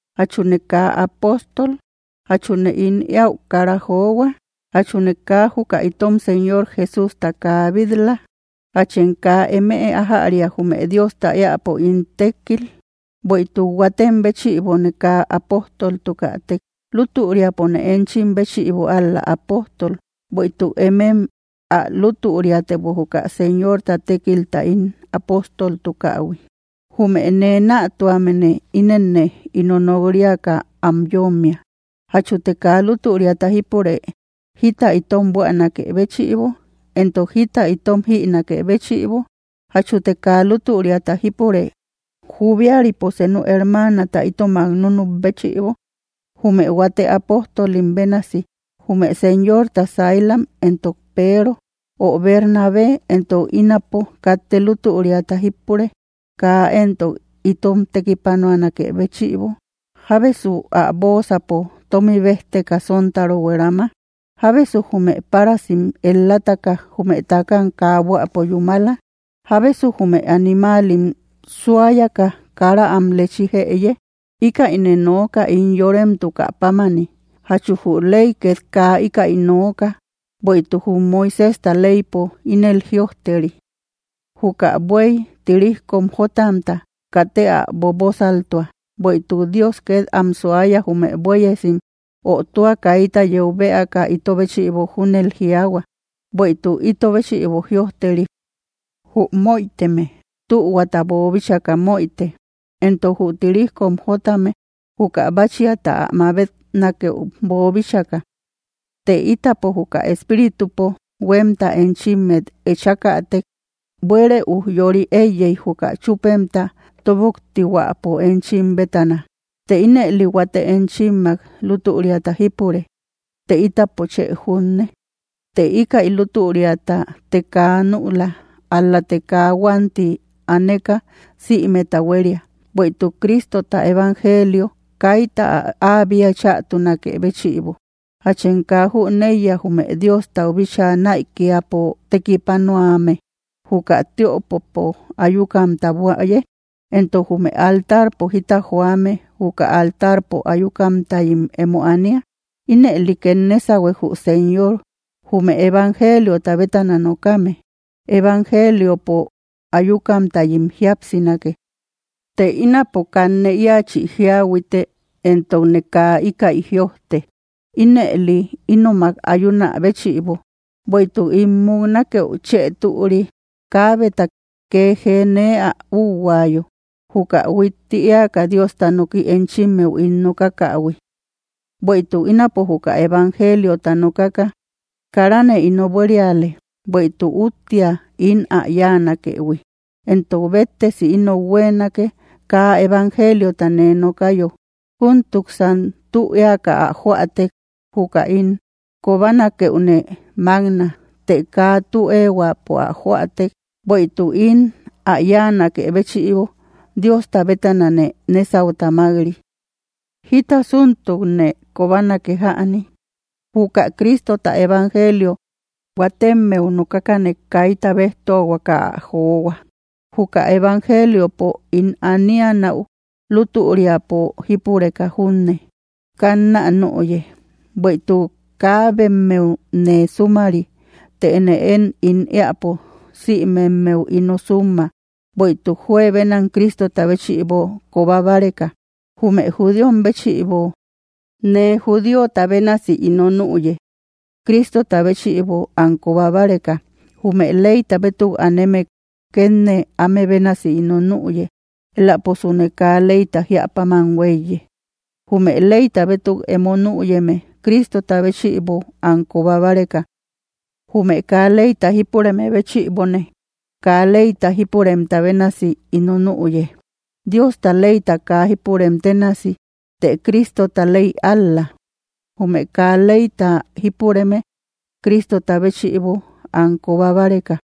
¿Jachune kaa apóstol? ¿Jachune ín eäu kara johua? ¿Jachune kaa juka itom Señor Jesústa kaa bit‑la? ¿Jachem kaa emëe ajäria jume Diosta eäpo ín tekkil? Bueïtuk huatem béchïbone kaa apojtoltukätek, lútüriapone enchim béchïbo ál‑la apojtol; bueïtuk emem ä lutüriatebo juka Señorta tekilpo ín apóstoltukähui. Jume nee natuamene inenne ino nokriaka am yommia: ¿Jachute kaa lutüriata jípure jita itom buänake béchïbo entok jita itom jinake béchïbo? ¿Jachute kaa lutüriata jípure jubiaripo senu hermata itomak nunüp béchïbo, jume huate apojtolim bénasi, jume Señorta saylam, entok Peero? ¿Ö Bernabé entok ínapo, katte lutüriata jípure kaa entok itom tekipanuanakë béchïbo? ¿Jábesu ä boosapo tomi bejteka sontaro huerama? ¿Jábesu jume parasim el‑lataka jume takam kaa buäpo yúmala? ¿Jábesu jume animalim suayaka kara am lechí jëye? ¿Íkäine nooka ín yoremtuka pámani? ¿Jachu jü ley ket kaa íkäi nooka? Bueïtuk jum Moiséjta leypo ínel jïojteri: “Juka bues tirijkom jotamta katë ä bobosaltua.” ¿Bueïtuk Dios ket am suaya jume buéesim? Ö, ¿tua kayta yeu beaka íto béchïbo júnel jiaahua? Bueïtuk íto béchïbo jïojteri; jü moïteme tuhuata boobíchaka moïte, entok jü tirijkom jotame juka báchiata ä mabetnakëu boobíchaka. Të itapo juka espíritupo huemta enchimmet echäkatek, ¿buere ujyori eiyey juka chupemta toboktihuäpo enchim bétana? Të ínëli huate enchimmak lutüriata jípure, ¿të itapo chë junne? Të íkäi lutüriata të kaa nüla, ál-late kaa huanti aneka sïmeta huéria, bueïtuk Cristota evangelio kayta ä bia chatunakë béchïbo. ¿Jachem kaa jüneiya jume Diostau bíchaa naïkiapo tekipanuame, juka tiöpopo ayukamtam buäye, entok jume altarpo jita joame juka altarpo ayukamtayim emo ania? Ínëli ket nesahuek jü Señor, jume evangeliota bétana nokame, evangeliopo ayukamtayim jiapsínake. Të ínapo kanne iachi jiahuiteka, entokne kaa íkäi jïojte ínëli ínomak ayuna béchïbo, bueïtuk ín muknakeu chë türi, kabeta kee jee nee ä üuhuayo, juka huitti eaka Diosta noki enchimmeu ín nokakähui. Bueïtuk ínapo juka evangeliota nokaka, karane ino buériale; bueïtuk úttia ín ä yáanakëhui, entok béttesi inou huenake kaa evangeliota nee nokayo. Juntuksan tü eaka ä joätek, juka ín kobanakeüne makna, të kaa tü ehuäpo ä joätek, bueïtuk ín ä yáanakë béchïbo Diosta bétanane nesauta mak-ri. ¿Jítasuntukne kobanake jäni? Juka Cristota evangelio huatemmeu nokakane kayta bejtuahuaka ä johua, juka evangeliopo ín anianäu lutüriata jípureka junne, kannä nüye. Bueïtuk kaabemmeu nee sumari, tëne én ín eäpo simemeu ino summa, bueïtuk juebenam Cristota béchïbo koba báreka. Jume judíom béchïbo nee judíota bénasi ino nüye, Cristota béchïbo am koba báreka, jume leyta bétuk aneme ket nee áme bénasi ino nüye (elaposune kaa leyta jíäpáman huéiye), jume leyta bétuk emo nüyeme Cristota béchïbo am koba báreka. Jume kaa leyta jipureme béchïbone, kaa leyta jipuremta bénasi ino nüye (Diosta leyta kaa jipurem tenasi, të Cristota ley ál‑la), jume kaa leyta jipureme Cristota béchïbo am koba báreka.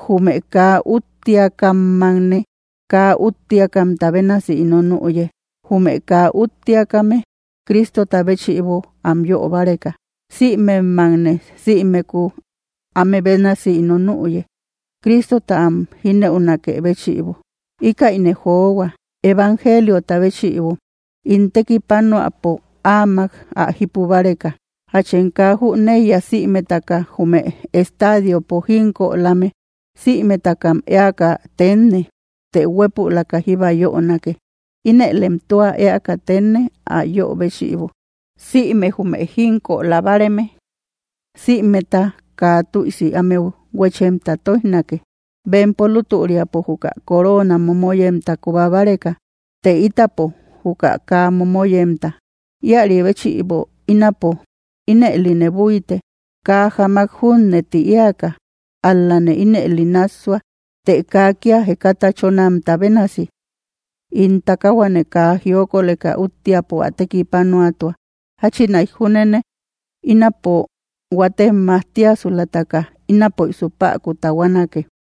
Jume kaa üttiakammakne kaa üttiakamta bénasi ino nüye, jume kaa üttiakame Cristota béchïbo am yö báreka, sïmemmakne, simeku áme bénasi ino nüye, Cristota am jineunakë béchïbo. Íkäine johua evangeliota béchïbo, ín tekipanuäpo áamak ä jipu báreka. ¿Jachem kaa jüneiya sïmetaka jume estadiopo jínkölame, sïmetakam eaka tenne, të huépülaka jíba yönake? Inëlem tua eaka tenne ä yöbéchïbo. Sïme jume jínkölabareme, sïmeta kaa tüisi ámeu huechemtam toijnake, bempo lutüriapo juka corona momoyemta koba báreka, të itapo, juka kaa momoyemta. Ïari béchïbo ínapo, ínëline buyte, kaa jáamak junne tï eaka, ál-lane ínëli nássua, të kaa kia jekata chónamta bénasi. In takahuane kaa jiokoleka úttiapo ä tekipanuatua, jáchinaik júnene ínapo huatem majtiasulataka, inaposu päku tahuanake.